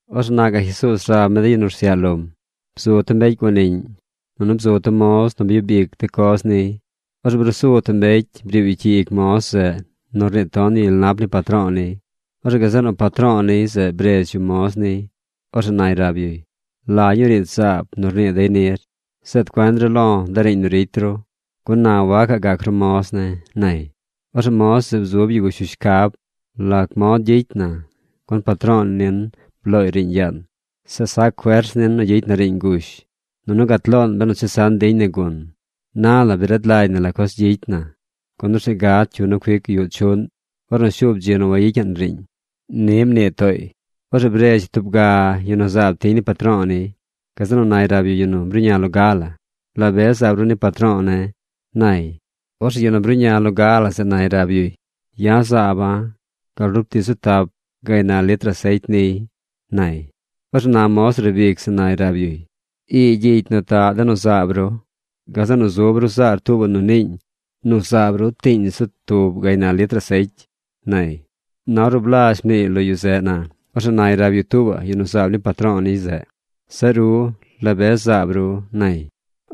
Orzeꞌ na gaꞌ Jesuuz rab mi de yu nu rsyaꞌ lom: ―Bzu tub mbecy guaniꞌñ. Nunu bzu tub moz nu byub ic de coz niy. Orzeꞌ bruu zu tub mbecy briib yu cyi ic moz zeꞌ nu rniit ton yu gyel nap ni patro̱o̱ niy. Orzeꞌ gazeꞌ nu patro̱o̱ niy zeꞌ bredz yu moz niy. Orzeꞌ nay rab yuy: “¿La ñuu riidz zaab nu rnii dey nir? Zeed cuen ru lo̱ de riiñ nu ricy ru, gun na wacaꞌ gac ru moz ne̱”, nay. Orzeꞌ moz zeꞌ bzub yu gush yu shcab: “¿Lac mod gyicy na? Gun patro̱o̱ nin blooy riiñ yaan. Zeꞌ sac fers nin nu gyicy na riiñ ngush, nunu gat loon benu chesan diñ na gun. Na la bi rad lagy na la coz gyicy na. Gun orzeꞌ gad cyu nu cuic yuꞌ chuꞌn ornu shuub dzi nu wayicyaꞌn riiñ.” Ni mnii tooy. Orzeꞌ bredz yu tub ga yu nu zaab tiñ ni patro̱o̱ niy. Gazeꞌ nu nay rab yu yu nu bruꞌña loga la: “¿La be zaab ru ni patro̱o̱ ne̱?”, nay. Orzeꞌ yu nu bruꞌña loga la zeꞌ nay rab yuy: “Ya̱ zaaba̱ gal rub tii zu tap gaynal litr asecy niy”, nay. Orzeꞌ na moz nu riib ic zeꞌ nay rab yuy: “Ii gyicy nu taꞌ de nu zaab ru. Gazeꞌ nu zub ru zaar tuubaꞌ nu niiñ nu zaab ru tiiñ zu tub gaynal litr asecy”, nay. Na ornu blazh mniiy lo yu zeꞌ na, orzeꞌ nay rab yu tuubaꞌ yu nu zaab ni patro̱o̱ niy zeꞌ: “Zeꞌ ru, ¿la be zaab ru?”, nay.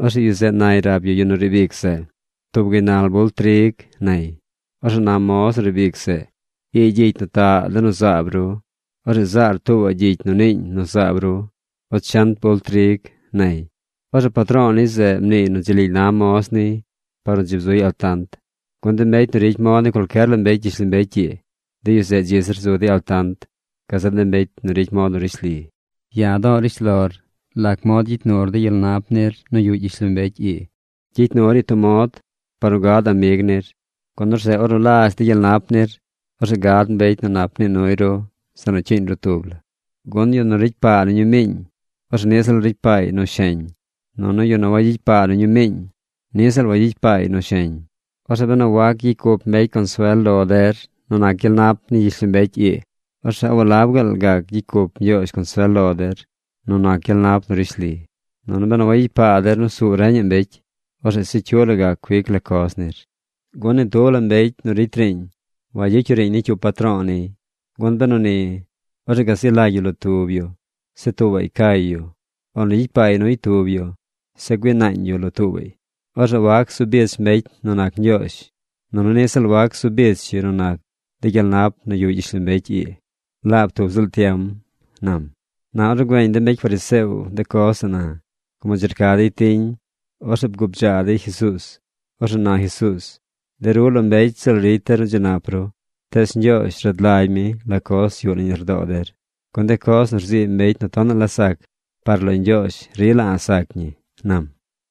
Orzeꞌ yu zeꞌ nay rab yu yu nu riib ic zeꞌ: “Tub gaynal bult trig”, nay. Orzeꞌ na moz nu riib ic zeꞌ: “Ii gyicy nu taꞌ de nu zaab ru. Orzeꞌ zaar tuubaꞌ gyicy nu niiñ nu zaab ru ochent bult trig”, nay. Orzeꞌ patro̱o̱ niy zeꞌ mniiy nu dzi lily na moz niy par nu dzi bzuy altant. Gun de mbecy nu ricy mod ni cualcyer la mbecy gyishlombecy ii, de yu zeꞌ dzi zir zu dey altant gazeꞌ de mbecy nu ricy mod nu rishli. ’Ya̱ do̱o̱ rishlor lac mod gyicy nur de gyel nap nir nu yuꞌ gyishlombecy ii. Gyicy nur ñii tub mod par nu gad amig nir. Gun orzeꞌ ornu lazh de gyel nap nir, orzeꞌ gad mbecy nu nap nii nuy ru zeꞌ nu cyiiñ ru tub la. ’Gun yu nu ricy paa nu ñumiiñ, orzeꞌ niꞌ ziꞌl ricy paay nu sheñ. Nunu yu nu wagyicy paa nu ñumiiñ, niꞌ ziꞌl wagyicy paay nu sheñ. Orzeꞌ benu wac gyicy cup mbecy consuel lo der nu nac gyel nap ni gyishlombecy ii, ¿orzeꞌ walab gaal gac gyicy cup Ñgyoozh consuel lo der nu nac gyel nap nu rishli? Nunu benu wayicy paa der nu suu reñaꞌ mbecy, orzeꞌ se cyu la cuic la coz nir. ’Gun ni tub la mbecy nu ricy riiñ wagyicy yu riiñ ni cyup patro̱o̱ niy. Gun benu ni, orzeꞌ ga zi lagy yu lo tub yu. Zeꞌ tuubaꞌy cay yu. O nu gyicy paay nuy tub yu. Zeꞌ güii naañ yu lo tuubaꞌy. Orzeꞌ wac zu bich mbecy nu nac Ñgyoozh, nunu niꞌ ziꞌl wac zu bich yu nu nac de gyel nap nu yuꞌ gyishlombecy ii laab tub ziꞌl tiem ―nam. Na ornu güeñ de mbecy fariseo de coz zeꞌ na, como dzi rca dey tiñ, orzeꞌ bgubdzaa dey Jesuuz. Orzeꞌ na Jesuuz: ―De ru lo mbecy ziꞌl ricy der nu dzi nap ru. Tees Ñgyoozh rad lagy mi la coz yuꞌ nañ lardoo der. Gun de coz nu rzii mbecy nu tonaꞌ la sac, par lo Ñgyoozh rila a̱ꞌ sac ñi ―nam―.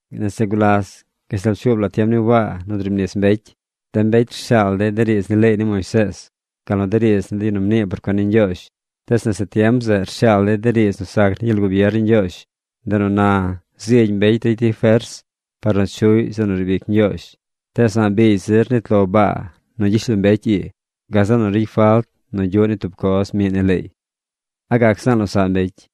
’Nese gulas gashtal pshuub la tiem ni Waa nu driib nis mbecy, de mbecy rshaal dey de riidz ni leey ni Moisees, gal nu de riidz ni de yu nu mnii por cuen ni Ñgyoozh. Tees nese tiem zeꞌ rshaal dey de riidz nu sac ni gyel gubier ni Ñgyoozh. Ndeꞌ nu na zigy mbecy ricy dey fers par nu chuꞌy zeꞌ nu riib ic Ñgyoozh. ’Tees a̱ꞌ biigy zir nit lo baa nu gyishlombecy ii, gazeꞌ nu ricy falt nu gyuꞌ ni tub coz miꞌ ni leey. ¿A gac zaan losaꞌ mbecy?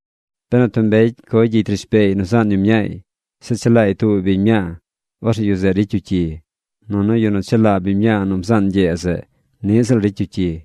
’Benu tub mbecy coy gyicy rishbeey nu zaan yu mñaay, zeꞌ chelaay tuubaꞌ biñ mñaa, orzeꞌ yu zeꞌ ricy yu cyi. Nunu yu nu chelaa biñ mñaa nu bzaan ñgyee zeꞌ niꞌ ziꞌl ricy yu cyi.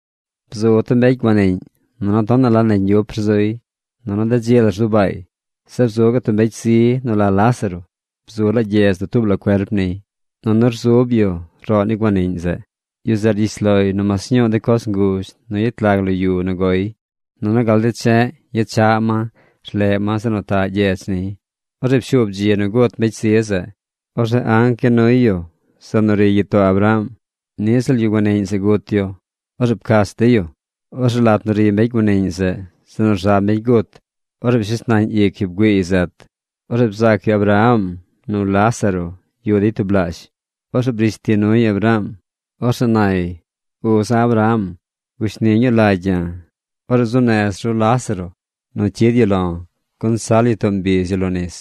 ’Bzu tub mbecy guaniꞌñ. Nunu tonaꞌ la negy ñgyup rzuy. Nunu de dzi la rzu baay. Zeꞌ bzu gaꞌ tub mbecy zi nu la Lázaro. Bzu laa gyedz dutuub la cuerp niy. Nunu rzub yu roꞌ ni guaniꞌñ zeꞌ. Yu zeꞌ rgyish loy nu mas ñuu de coz nguzh nu yet lag lo yu nu goy. Nunu gal de che̱ꞌ yechaꞌ ma rleꞌ ma zeꞌ nu taꞌ gyedz niy. Orzeꞌ pshuub dzi nu gut mbecy zi zeꞌ. Orzeꞌ anc ya nuy yu zeꞌ nu ri gyitoo Abraham. Niꞌ ziꞌl yu guaniꞌñ zeꞌ gut yu. Orzeꞌ pcach dey yu. ’Orzeꞌ lat nu ri mbecy guaniꞌñ zeꞌ, zeꞌ nu rza mbecy gut, orzeꞌ pshes nañ ic yu bgüiiy zet. Orzeꞌ bzaac yu Abraham nu Lázaro yuꞌ dey tublaazh. Orzeꞌ brish ti nuy Abraham. Orzeꞌ nay: “¡Uza̱ Abraham, gushni ñuu lagy ya̱! Orzeꞌ zuu nez ru Lázaro nu cyid yu lo̱, gun sal yu too mbiz yu lo nis.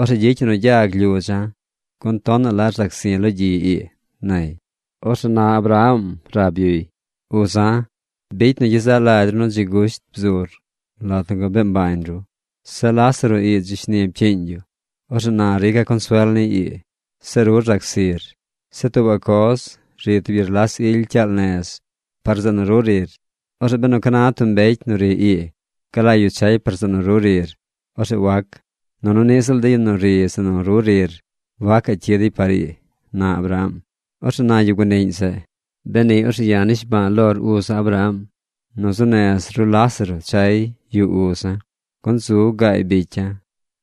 Orzeꞌ gyicy yu nu gyag lyudza̱, gun tonaꞌ la rzac zi̱ lo gyi ii”, nay. Orzeꞌ na Abraham rab yuy: “Uza̱, bicy nu gyezaꞌ lagy nu ru dzi gusht bzur lat nu gabee mbañ ru. Zeꞌ Lázaro ii dzi shni pcyiiñ yu. Orzeꞌ na ya̱ rica̱ consuel niy ii. Zeꞌ ru rzac zir. Zeꞌ tuubaꞌ coz, ri tub gyerlas ily cyaal nez par zeꞌ nu ru rir. Orzeꞌ benu ca na tub mbecy nu ri ii galagy yu chay par zeꞌ nu ru rir, orzeꞌ wac. Nunu niꞌ ziꞌl de yu nu ri zeꞌ nu ru rir wacaꞌ cyid dey par ii”, na Abraham. ’Orzeꞌ na yu guaniꞌñ zeꞌ: “Beni orzeꞌ ya̱ nishba̱a̱ lor uza̱ Abraham nu zuu nez ru Lázaro chay yuꞌ uza̱. Gun zu gaay bicya̱.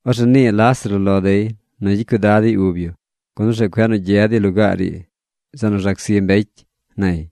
Orzeꞌ nii Lázaro lo dey nu gyicy cuidad dey ub yu, gun orzeꞌ cueꞌ nu gyed dey lugaar ii zeꞌ nu rzac zi mbecy”, nay.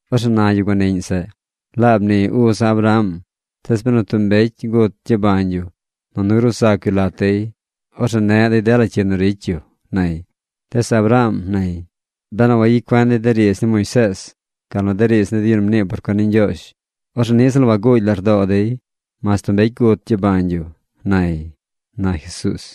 Orzeꞌ na yu guaniꞌñ zeꞌ: “Laab ni uza̱ Abraham, tees benu tub mbecy gut gyabañ yu nunu gruu zac yu lat dey, orzeꞌ neꞌ dey dela cyi nu ricy yu”, nay. Tees Abraham nay: “Benu wayicy cuen dey de riidz ni Moisees gal nu de riidz ni de yu nu mnii por cuen ni Ñgyoozh, orzeꞌ niꞌ ziꞌl waguugy lardoo dey mas tub mbecy gut gyabañ yu”, nay ―na Jesuuz.